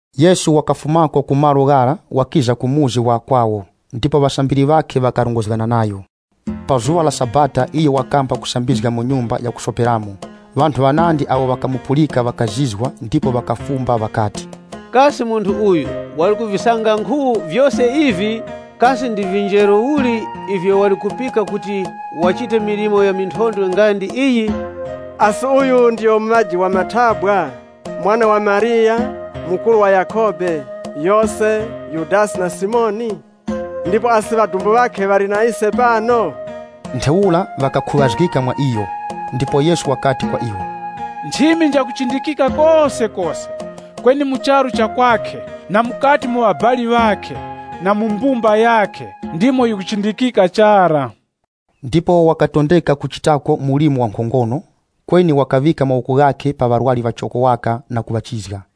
Yesu wakafumako ku malo ghara, wakiza ku muzi wa kwawo, ndipo ŵasambiri ŵakhe ŵakarongozgana nayo. Pa zuŵa la Sabata iyo wakamba kusambizga mu nyumba ya kusoperamo. Ŵanthu ŵanandi awo ŵakamupulika ŵakazizwa ndipo ŵakafumba ŵakati, “Kasi munthu uyu wali kuvisanga nkhu vyose ivi? Kasi ndi vinjeru uli ivyo wali kupika kuti wachite milimo ya minthondwe nga ndi iyi? Asi uyu ndiyo muŵaji wa mathabwa, mwana wa Mariya, mukuru wa Yakhobe, Yose, Yudasi na Simoni? Ndipo asi ŵadumbu ŵakhe ŵali na ise pano?” Ntheura ŵakakhuŵazgika mwa iyo. Ndipo Yesu wakati kwa iwo, “Nchimi njakuchindikika kosekose, kweni mu charu cha kwakhe na mukati mu ŵabali ŵakhe na mu mbumba yakhe, ndimo yikuchindikika chara.” Ndipo wakatondeka kuchitako mlimo wankhongono, kweni wakaŵika mawoko ghakhe pa ŵarwari ŵachoko waka na kuŵachizga.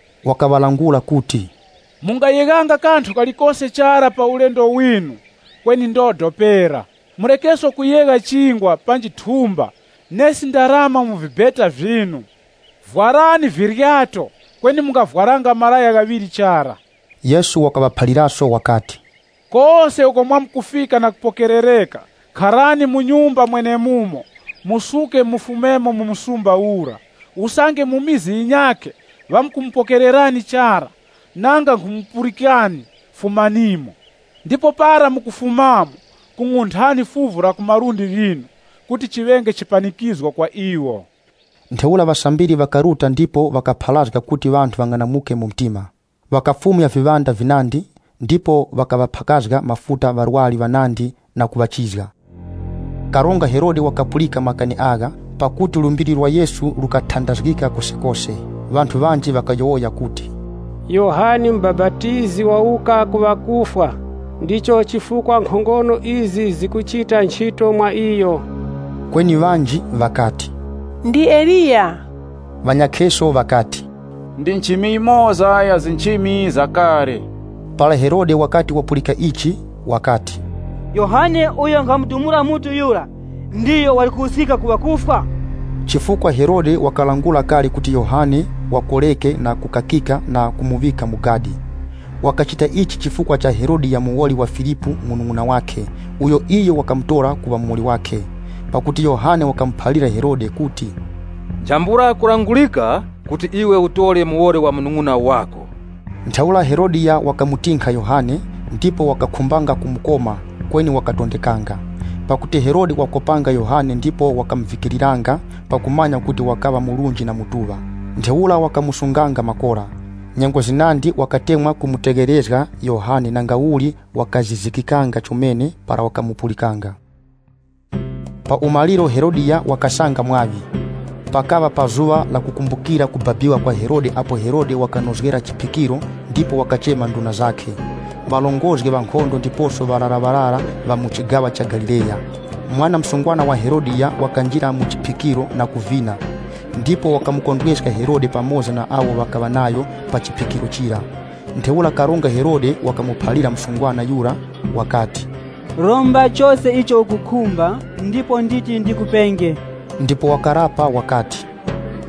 Wakaŵalangula kuti, “Mungayeghanga kanthu kalikose chara pa ulendo winu kweni ndodo pera. Murekeso kuyegha chingwa panji thumba nesi ndarama mu vibeta vyinu. Vwarani viryato kweni mungavwaranga malaya ghaŵiri chara.” Yesu wakaŵaphaliraso wakati, “Kose uko mwamkufika na kupokerereka, kharani mu nyumba mwenemumo musuke mufumemo mu msumba ura. Usange mu mizi yinyakhe ŵakumupokererani chara, nanga nkhumupulikani, fumanimo. Ndipo para mukufumamo kung'unthani fuvu la ku malundi ghinu kuti chiŵenge chipanikizgo kwa iwo.” Ntheura ŵasambiri ŵakaruta ndipo ŵakapharazga kuti ŵanthu ŵang'anamuke mu mtima. Ŵakafumya viŵanda vinandi, ndipo ŵakaŵaphakazga mafuta ŵarwari ŵanandi na kuŵachizga. Karonga Herode wakapulika makani agha, pakuti lumbiri lwa Yesu lukatandazgika kosekose. Ŵanthu ŵanji ŵakayowoya kuti, “Yohane Mubapatizi wawuka ku ŵakufwa, ndicho chifukwa nkhongono izi zikuchita nchito mwa iyo.” Kweni ŵanji ŵakati, “Ndi Eliya.” Ŵanyakheso ŵakati, “Ndi nchimi yimoza ya nchimi za kale.” Para Herode wakati wapulika ichi, wakati, “Yohane uyo nkhamudumula mutu yura ndiyo wali kuwuskika ku ŵakufwa!” Chifukwa Herode wakalangula kale kuti Yohane wakoreke na kukakika na kumuŵika mu gadi. Wakachita ichi chifukwa cha Herodiya muwoli wa Filipu munung'una wakhe, uyo iyo wakamutora kuŵa muwoli wakhe. Pakuti Yohane wakamuphalira Herode kuti, “Nchambula kulangurika kuti iwe utore muwoli wa munung'una wako.” Ntheura Herodiya wakamutinkha Yohane, ndipo wakakhumbanga kumukoma, kweni wakatondekanga. Pakuti Herode wakopanga Yohane ndipo wakamuvikiriranga pakumanya kuti wakaŵa munthu murunji na mutuŵa. Ntheura wakamusunganga makora. Nyengo zinandi wakatemwa kumutegherezga Yohane nangauli wakazizikikanga chomene para wakamupulikanga. Pa umaliro Herodiya wakasanga mwaŵi. Pakaŵa pa zuŵa lakukumbukira kubabika kwa Herode apo Herode wakanozgera chiphikiro ndipo wakachema nduna zakhe, ŵarongozgi ŵa nkhondo ndiposo ŵararaŵarara ŵa mu chigaŵa cha Galileya. Mwana msungwana wa Herodiya wakanjira mu chiphikiro na kuvina, ndipo wakamukondweska Herode pamoza na awo ŵakaŵa nayo pa chiphikiro chira. Ntheura Karonga Herode wakamuphalira msungwana yura wakati, “Romba chose icho ukukhumba ndipo nditi ndikupenge.” Ndipo wakapangana nayo wakati,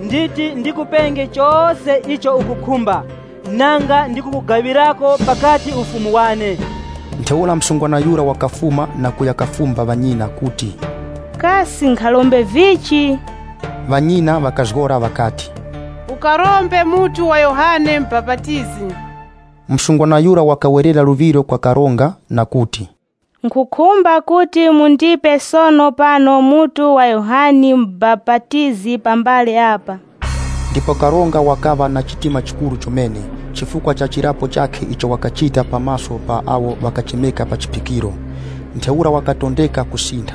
“Nditi ndikupenge chose icho ukukhumba nanga ndi kukugaŵirako pakati ufumu wane.” Ntheura msungwana yura wakafuma na kuya kafumba ŵanyina kuti, “Kasi nkharombe vichi?” Ŵanyina ŵakazgora ŵakati, “Ukarombe mutu wa Yohane Mubapatizi.” Msungwana yura wakawerera luŵiro kwa karonga na kuti, “Nkhukhumba kuti mundipe sono pano mutu wa Yohane Mubapatizi pa mbale apa.” Ndipo karonga wakaŵa na chitima chikuru chomene, chifukwa cha chirapo chakhe icho wakachita pa maso pa awo ŵakachemeka pa chiphikiro. Ntheura wakatondeka kusintha.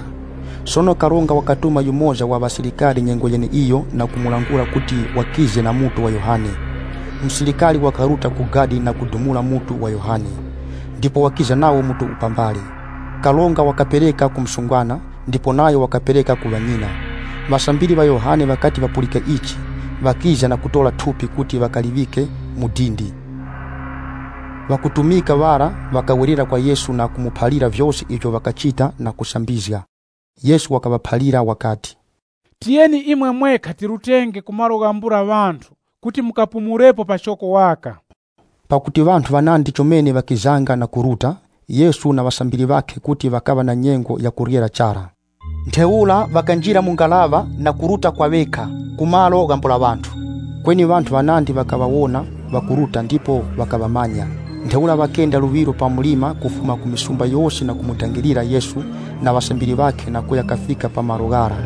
Sono karonga wakatuma yumoza wa ŵasilikari nyengo yeneiyo na kumulangula kuti wakize na mutu wa Yohane. Musilikari wakaruta ku gadi na kudumula mutu wa Yohane. Ndipo wakiza nawo mutu pa mbale. Karonga wakapereka ku msungwana, ndipo nayo wakapereka ku ŵanyina. Ŵasambiri ŵa Yohane ŵakati ŵapulika ichi, ŵakiza na kutora thupi kuti ŵakaliŵike mu dindi. Ŵakutumika ŵara ŵakawerera kwa Yesu na kumuphalira vyose ivyo ŵakachita na kusambizga. Yesu wakaŵaphalira wakati, “Tiyeni imwe mwekha tirutenge ku malo ghambula ŵanthu kuti mukapumulepo pachoko waka.” Pakuti ŵanthu ŵanandi chomene ŵakizanga na kuruta, Yesu na ŵasambiri ŵakhe kuti ŵakaŵa na nyengo ya kuryera chara. Ntheura ŵakanjira mu ngaraŵa na kuruta kwa ŵekha ku malo ghambula ŵanthu. Kweni ŵanthu ŵanandi ŵakaŵawona ŵakuruta ndipo ŵakaŵamanya. Ntheura ŵakenda luŵiro pa mlima kufuma ku mizi yose na kumudangirira Yesu na ŵasambiri ŵakhe na kuya kafika pa malo ghara.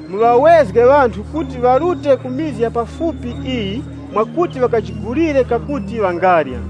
Muŵawezge ŵanthu kuti ŵarute ku vikaya vya pafupi ivi mwakuti ŵakajigulire ako ŵangarya.”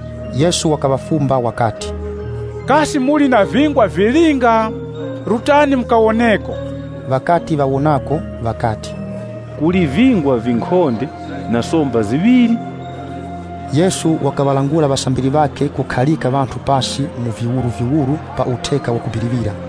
Yesu wakaŵafumba wakati, “Kasi muli na vingwa vilinga? Rutani mukawoneko.” Ŵakaya kasanga kuti, “Kuli vingwa vinkhonde na somba ziŵiri.” Yesu wakaŵalangula ŵasambiri ŵakhe kukharika ŵanthu pasi mu viwuruviwuru pa utheka wakubiriŵira.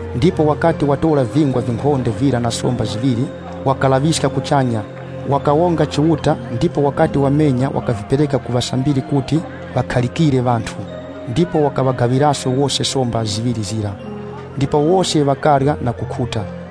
Ndipo wakati watora vingwa vinkhonde vira na somba ziŵiri, wakalaŵiska kuchanya, wakawonga Chiuta ndipo wakati wamenya wakavipereka ku ŵasambiri kuti ŵakharikire ŵanthu. Ndipo wakaŵagaŵiraso wose somba ziŵiri zira. Ndipo wose ŵakarya na kukhuta.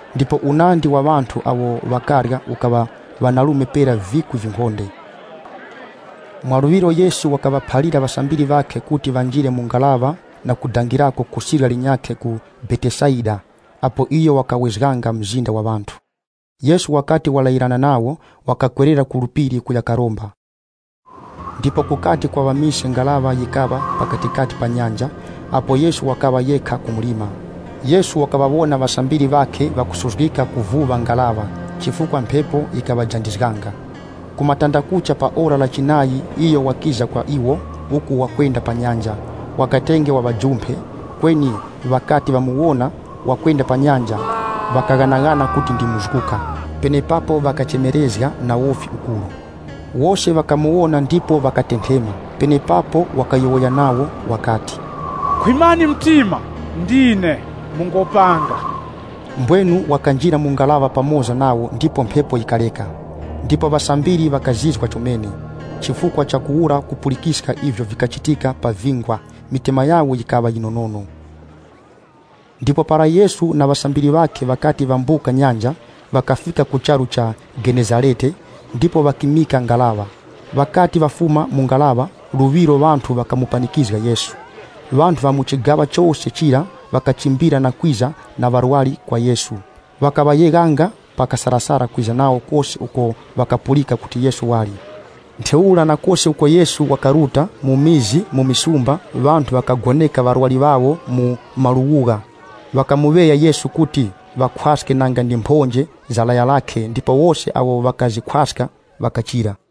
Ndipo unandi wa ŵanthu awo ŵakarya ukaŵa ŵanarume pera vikwi vinkhonde. Mwaluŵiro Yesu wakaŵaphalira ŵasambiri ŵakhe kuti ŵanjire mu ngaraŵa na kudangirako ku sirya linyakhe ku Betesaida, apo iyo wakawezganga mzinda wa ŵanthu. Yesu wakati walayirana nawo, wakakwerera ku phiri kuya karomba. Ndipo kukati kwaŵa mise ngaraŵa yikaŵa pakatikati pa nyanja, apo Yesu wakaŵa yekha ku mlima. Yesu wakaŵawona ŵasambiri ŵakhe ŵakusuzgika kuvuŵa ngaraŵa, chifukwa mphepo yikaŵajandizganga. Ku matandakucha pa ora la chinayi iyo wakiza kwa iwo uku wakwenda pa nyanja, wakatenge waŵajumphe, kweni ŵakati ŵamuwona wakwenda pa nyanja, ŵakaghanaghana kuti ndi muzguka. Penepapo ŵakachemerezga na wofi ukuru. Wose ŵakamuwona ndipo ŵakatenthema. Penepapo wakayowoya nawo wakati, “Khwimani mtima! Ndine, mungopanga.” Mbwenu wakanjira mu ngaraŵa pamoza nawo ndipo mphepo yikareka. Ndipo ŵasambiri ŵakazizwa chomene, chifukwa chakuwura kupulikiska ivyo vikachitika pa vingwa, mitima yawo yikaŵa yinonono. Ndipo para Yesu na ŵasambiri ŵakhe ŵakati ŵambuka nyanja, ŵakafika ku charu cha Mutezarete ndipo ŵakimika ngaraŵa. Ŵakati ŵafuma mu ngaraŵa, luŵiro ŵanthu ŵakamupanikizga Yesu. Ŵanthu ŵa mu chigaŵa chose chira ŵakachimbira na kwiza na ŵarwari kwa Yesu. Ŵakaŵayeghanga pa kasarasara kwiza nawo kose uko ŵakapulika kuti Yesu wali. Ntheura na kose uko Yesu wakaruta, mu vikaya, mu misumba, ŵanthu ŵakagoneka ŵarwari ŵawo mu maluwugha. Ŵakamuŵeya Yesu kuti ŵakhwaske nanga ndi mphonje za laya lakhe, ndipo wose awo ŵakazikhwaska ŵakachira.